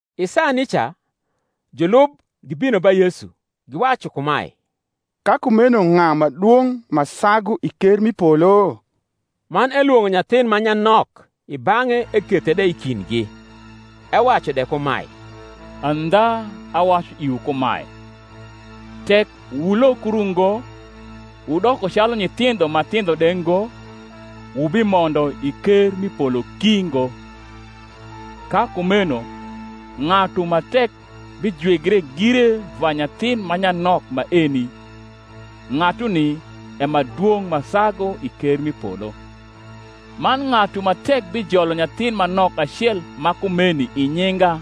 I saa nica julub gibino ba Yesu, giwacu kumae, Ka kumeno ng’a ma dwong’ ma sagu i ker m’i polo? Man elwong’o nyathin ma nyanok i bang’e ekethe de i kindgi, ewacu de kumae, Andha awacu iwu kumae, Tek wulokru ngo, wudoko calu nyithindho ma thindho de ngo, wubimondo i ker m’i polo ki ngo. Ka kumeno ng’atu ma tek bijwigre gire va nyathin ma nyanok maeni, ng’atuni e ma dwong’ ma sagu i ker m’i polo. Man ng’atu ma tek bijolo nyathin ma nok acel ma kumeni i nyinga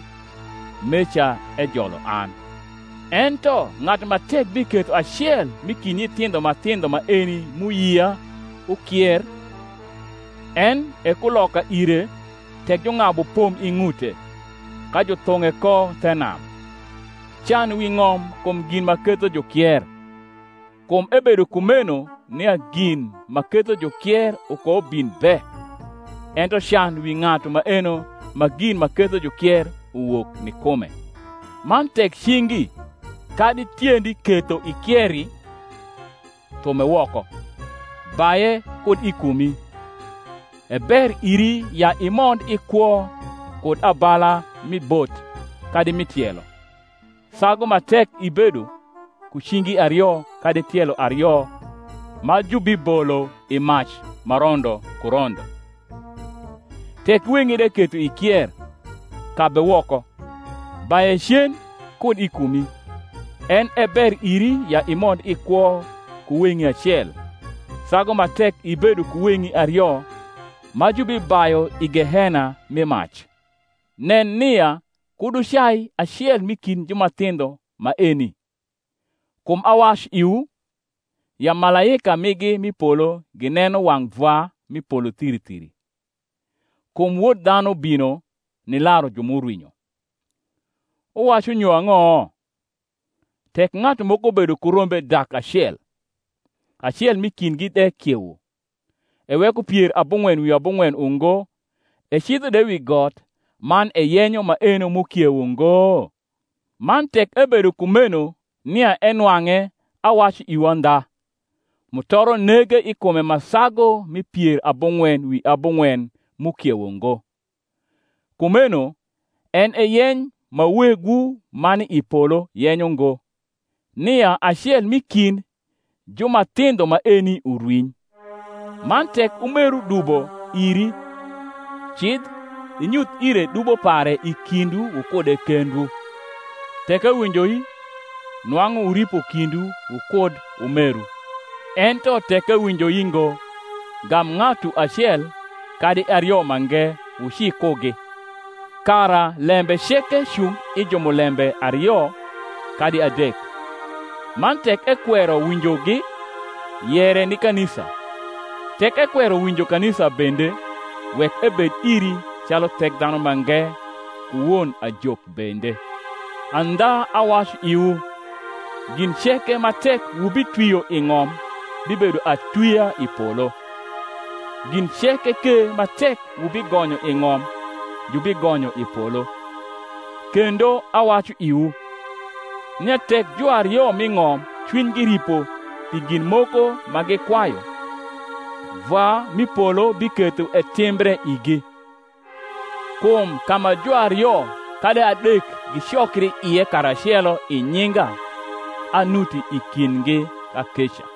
meca ejolo an. Ento ng’atu ma tek biketho acel m’i kind nyithindho ma thindho maeni m’uyia ukier, en e kuloka ire tek jung’abu pom i ng’ute, ka juthung’e ko the nam. Can wi ng’om kum gin ma ketho jukier! kum ebedo kumeno nia gin ma ketho jukier ukoubin be; ento can wi ng’atu maeno ma gin ma ketho jukier uwok ni kume! Man tek cingi kadi tiendi ketho ikieri, thume woko, baye kud i kumi: e ber iri ya imond i kwo kud abala mi bot kadi mi tielo, sagu ma tek ibedo ku cingi ario kadi tielo ario ma jubibolo i mac ma rondo ku rondo. Tek weng’i de ketho ikier, kabe woko, baye cen kud i kumi: en e ber iri ya imond i kwo ku weng’i acel, sagu ma tek ibedo ku weng’i ario ma jubibayu i gehena rni mac. Nen nia kud wucai acel m’i kind ju ma thindho maeni: kum awacu iwu, ya malaika migi m’i polo gineno wang’ Vwa m’i polo thiri thiri. Kum Wod dhanu bino nilaru ju m’urwinyo. Wuwacu nyo ang’o? tek ng’atu moko bedo ku rombe dak acel, acel m’i kindgi de kiewo, eweko pier abung’wen wi abung’wen ungo, ecidho de wi got, man eyenyo maeno m’ukiewo ngo? Man tek ebedo kumeno nia enwang’e awacu iwu andha, mutoro nege i kume ma sagu mi pier abung’wen wi abung’wen m’ukiewo ngo. Kumeno en e yeny ma Wegwu ma ni i polo yenyo ngo, nia acel m’i kind ju ma thindho maeni urwiny. Man tek umeru dubo iri, cidh, inyuth ire dubo pare i kindwu wukude kendwu: tek ewinjoi, nwang’u wuripo kindwu wukud umeru. Ento tek ewinjoi ngo, gam ng’atu acel kadi ario mange wuci kugi, kara lembe ceke cung i jumulembe ario kadi adek. Man tek ekwero winjogi, yere ni kanisa: tek ekwero winjo kanisa bende, wek ebed iri calu Thekdhanumange ku won ajok bende. Andha awacu iwu, Gin ceke ma tek wubitwio i ng’om bibedo atwia i polo; gin ceke ke ma tek wubigonyo i ng’om jubigonyo i polo. Kendo awacu iwu, nia tek juario m’i ng’om cwinygi ripo pi gin moko ma gikwayu, Vwa m’i polo biketho etimbre igi. Kum ka ma juario kadi adek gicokri ie karacelo i nyinga, anuti i kindgi kakeca.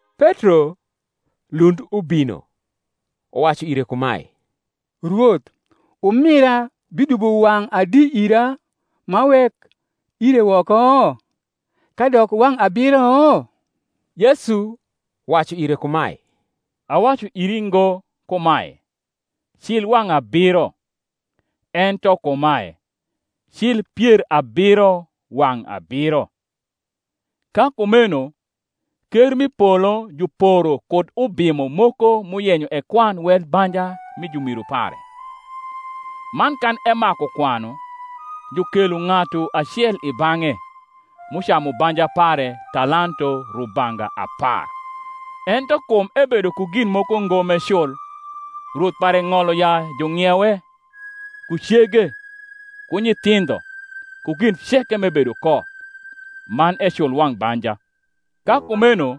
Petro lund ubino uwacu ire kumae, Rwoth, umira bidubo wang’ adi ira, m’awek ire woko? kadok wang’ abiro? Yesu wacu ire kumae, Awacu iri ngo kumae, Cil wang’ abiro; ento kumae, Cil pier abiro wang’ abiro. Ka kumeno ker m’i polo juporo kud ubimo moko m’uyenyo ekwan wel banja mi jumiru pare. Man kan emaku kwanu, jukelo ng’atu acel i bang’e, m’ucamu banja pare talanto rubanga apar. Ento kum ebedo ku gin moko ngo m’ecul, rwoth pare ng’olo ya jung’iewe, ku cege, ku nyithindho, ku gin ceke m’ebedo ko, man ecul wang’ banja. Ka kumeno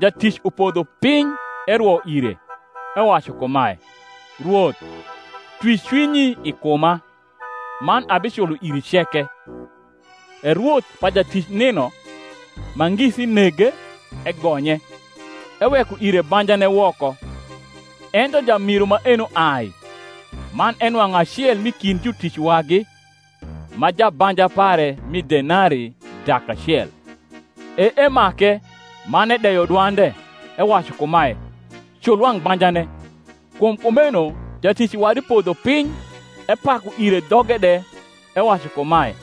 jatic upodho piny erwo ire, ewacu kumae, Rwoth, twi cwinyi i kuma, man abiculo iri ceke. E rwoth pa jatic nino, ma ngisi nege, egonye, eweko ire banjane woko. Ento jamiru maeno ai, man enwang’u acel m’i kind jutic wagi, ma jabanja pare mi denarii dak acel: e emake, man edeyo dwande, ewacu kumae, Cul wang’ banjane. Kum kumeno jatic wadi podho piny epaku ire dhoge de, ewacu kumae,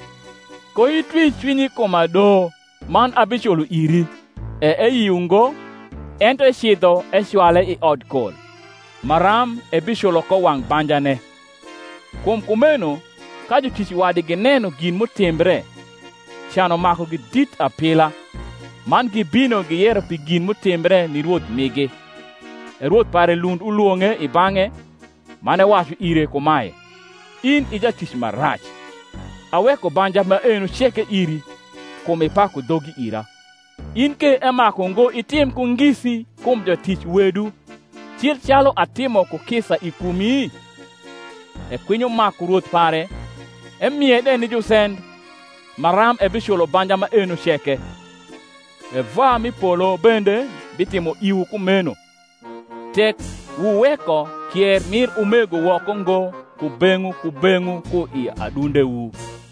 Koitwi cwinyi i kuma do, man abiculo iri. E eyio ngo: ento ecidho ecwale i odkol, maram ebiculo ko wang’ banjane. Kum kumeno ka jutic wadi gineno gin m’utimbre, can umakugi dit apila, man gibino giyero pi gin m’utimbre ni rwoth migi. E rwoth pare lund ulwong’e i bang’e, man ewacu ire kumae, In i jatic ma rac, aweko banja maeno ceke iri, kum ipaku dhogi ira: in ke emaku ngo itim ku ngisi kum jatic wedu, cil calu atimo ku kisa i kumi? E kwinyo maku rwoth pare, emie de ni jusend, maram ebiculo banja maeno ceke. E Vwa m’i polo bende bitimo iwu kumeno, tek wuweko kier rnir umego woko ngo kubeng’wu kubeng’wu ku i adundewu.